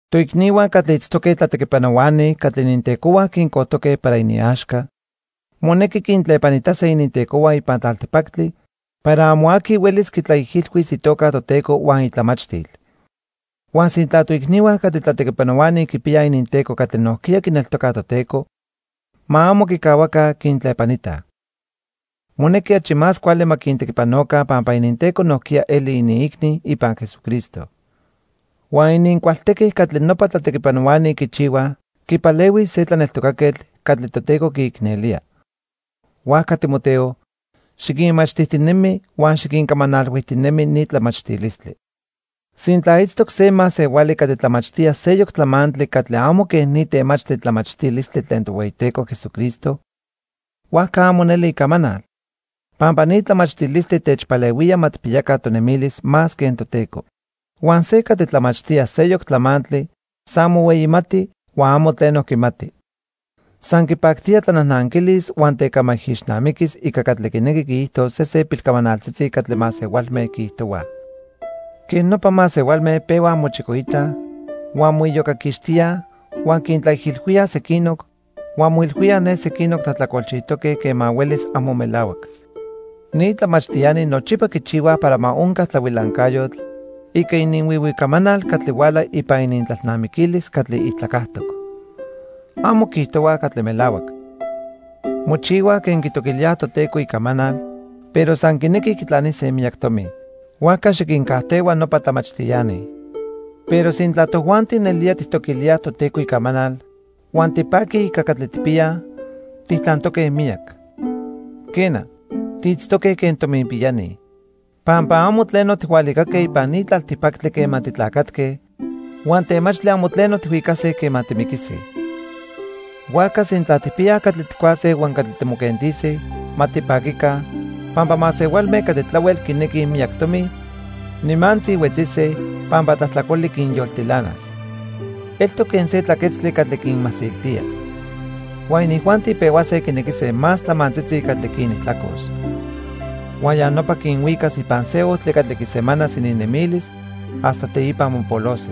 Toicnihua catli itztoque tlatequipanohuani catli inintecohua quincojtoque para iniaxca monequi quintlepanitase inintecohua ipan tlaltipactli para amo aqui huelis quitlaijilhuis itoca Toteco huan itlamachtil. Huan sintla toicnihua catli tlatequipanohuani quipiyaj ininteco catli nojquiya quineltocaj Toteco, ma amo quicahuaca quintlepanitaj. Monequi achi más cuali ma quintequipanoca pampa ininteco nojquiya eli iniicni ipan Jesucristo. Huan inincualtequi catli nopa tlatequipanohuani quichihuaj quipalehuis se tlaneltocaquetl catli Toteco quiicnelía. Huajca Timoteo, xiquinmachtijtinemi huan xiquincamanalhuijtinemi ni tlamachtilistli. Sintla itztoc se masehuali catli tlamachtía seyoc tlamantli catli amo quen ni temachtli tlamachtilistli tlen Tohueyiteco Jesucristo, huajca amo neli icamanal, pampa ni tlamachtilistli techpalehuía ma tijpiyaca tonemilis más quen Toteco. Huan se catli tlamachtía seyoc tlamantli san mohueyimati huan amo tleno quimati. San quipactía tlanajnanquilis huan tecamaijixnamiquis ica catli quinequi quiijtos sesen pilcamanaltzitzi catli masehualme quiijtohuaj. Quej nopa masehualme pehuaj mochicoitaj, huan moiyocaquixtíaj, huan quintlaijilhuíaj sequinoc, huan moilhuíaj ne sequinoc tlajtlacolchijtoque quema huelis amo melahuac. Ni tlamachtiani nochipa quichihuaj para ma onca tlahuilancayotl ica ininhuihui camanal catli huala ipan inintlalnamiquilis catli ijtlacajtoc. Amo quiijtohuaj catli melahuac. Mochihuaj quen quitoquilíaj Toteco icamanal, pero san quinequij quitlanise miyac tomi. Huajca xiquincajtehua nopa tlamachtiani. Pero sintla tojuanti nelía tijtoquilíaj Toteco icamanal huan tipaquij ica catli tijpiyaj, tijtlantoque miyac. Quena, tiitztoque quen tominpiyani. Pampa amo tleno tijhualicaque ipan ni tlaltipactli quema titlacatque huan temachtli amo tleno tijhuicase quema timiquise. Huajca sintla tijpiyaj catli tijcuase huan catli timoquentise, ma tipaquica, pampa masehualme catli tlahuel quinequij miyac tomi, nimantzi huetzise, pampa tlajtlacoli quinyoltilanas. Eltoc quen se tlaquetztli catli quinmasiltía. Huan inijuanti pehuase quinequise más tlamantzitzi catli quinijtlacos. Huan ya nopa quinhuicas ipan se ojtli catli quisemanas ininnemilis hasta teipa mopolose.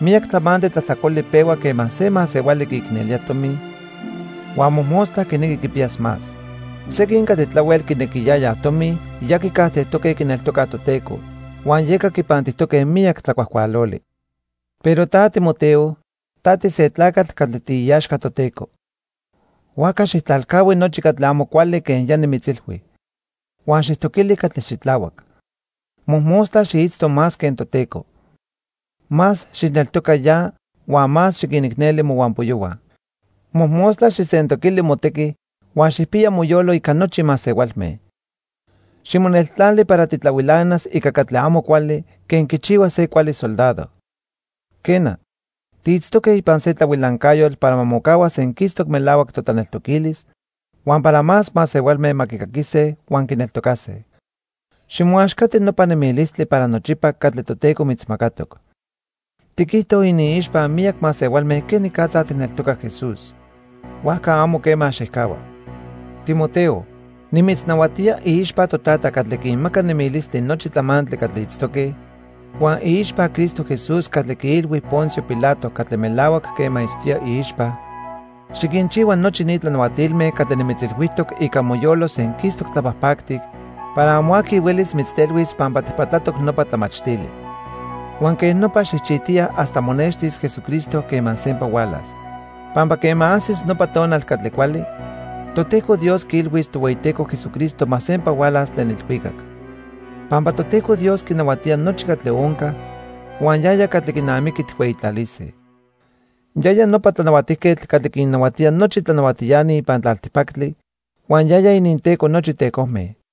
Miyac tlamantli tlajtlacoli pehua quema se masehuali quiicnelía tomi huan mojmostla quinequi quipiyas más. Sequin catli tlahuel quinequiyayaj tomi ya quicajtejtoque quineltocaj Toteco huan yeca quipantijtoque miyac tlacuajcualoli. Pero ta Timoteo, ta tise tlacatl catli tiiaxca Toteco. Huajca xijtlalcahui nochi catli amo cuali quen ya nimitzilhui. Huan xijtoquili catli xitlahuac. Mojmostla xiitzto más quen Toteco. Más xijneltoca ya huan más xiquinicneli mohuampoyohua. Mojmostla xijsentoquili motequi huan xijpiya moyolo ica nochi masehualme. Ximoneltlali para titlahuilanas ica catli amo cuali quen quichihua se cuali soldado. Quena, tiitztoque ipan se tlahuilancayotl para ma mocahua senquistoc melahuac totlaneltoquilis huan para más masehualme ma quicaquise huan quineltocase. Ximoaxcati nopa nemilistli para nochipa catli Toteco mitzmacatoc. Tiquijto iniixpa miyac masehualme quenicatza tijneltoca Jesús; huajca amo quema xijcahua. Timoteo, nimitznahuatía iixpa Totata catli quinmaca nemilistli nochi tlamantli catli itztoque huan iixpa Cristo Jesús catli quiilhui Poncio Pilato catli melahuac quema itztoya iixpa, xiquinchihua nochi ni tlanahuatilme catli nimitzilhuijtoc ica moyolo senquistoc tlapajpactic para amo aqui huelis mitztelhuis pampa tijpatlatoc nopa tlamachtili. Huan quej nopa xijchijtiya hasta monextis Jesucristo quema sempa hualas. Pampa quema ajsis nopa tonal catli cuali, Toteco Dios quiilhuis Tohueyiteco Jesucristo ma sempa hualas tlen ilhuicac. Pampa Toteco Dios quinahuatía nochi catli onca huan yaya catli quinamiqui tijhueyitlalise. Yaya nopa Tlanahuatijquetl catli quinnahuatía nochi tlanahuatiani ipan tlaltipactli huan yaya ininTeco nochi tecojme.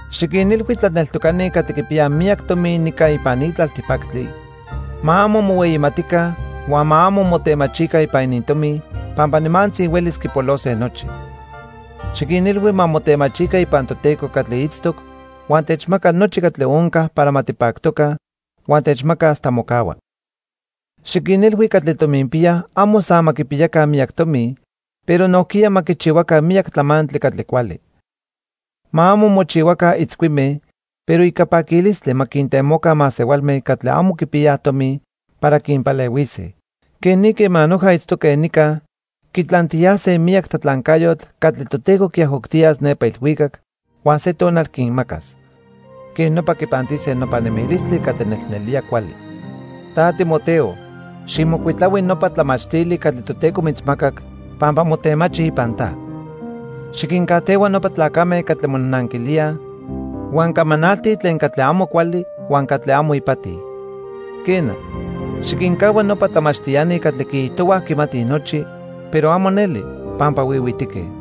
Xiquinilhui tlaneltocani catli quipiyaj miyac tomi nica ipan ni tlaltipactli, ma amo mohueyimatica huan ma amo motemachica ipan inintomi pampa nimantzi huelis quipolose nochi. Xiquinilhui ma motemachica ipan Toteco catli itztoc huan techmaca nochi catli onca para ma tipactoca huan techmaca hasta mocahua. Xiquinilhui catli tominpiyaj amo san ma quipiyaca miyac tomi, pero nojquiya ma quichihuaca miyac tlamantli catli cuali. Ma amo mochihuaca itzcuime, pero ica paquilistli ma quintemoca masehualme catli amo quipiyaj tomi para quinpalehuise. Quej ni quema noja itztoque nica quitlantiyase miyac tlatlancayotl catli Toteco quiajoctiyas nepa ilhuicac huan se tonal quinmacas. Quej nopa quipantise nopa nemilistli catli nelnelía cuali. Ta Timoteo, xijmocuitlahui nopa tlamachtili catli Toteco mitzmacac pampa motemachi ipan ta. Xiquincajtehua nopa tlacame catli monajnanquilíaj huan camanaltij tlen catli amo cuali huan catli amo ipati. Quena, xiquincahua nopa tlamachtiani catli quiijtohuaj quimatij nochi, pero amo neli, pampa huihuitique.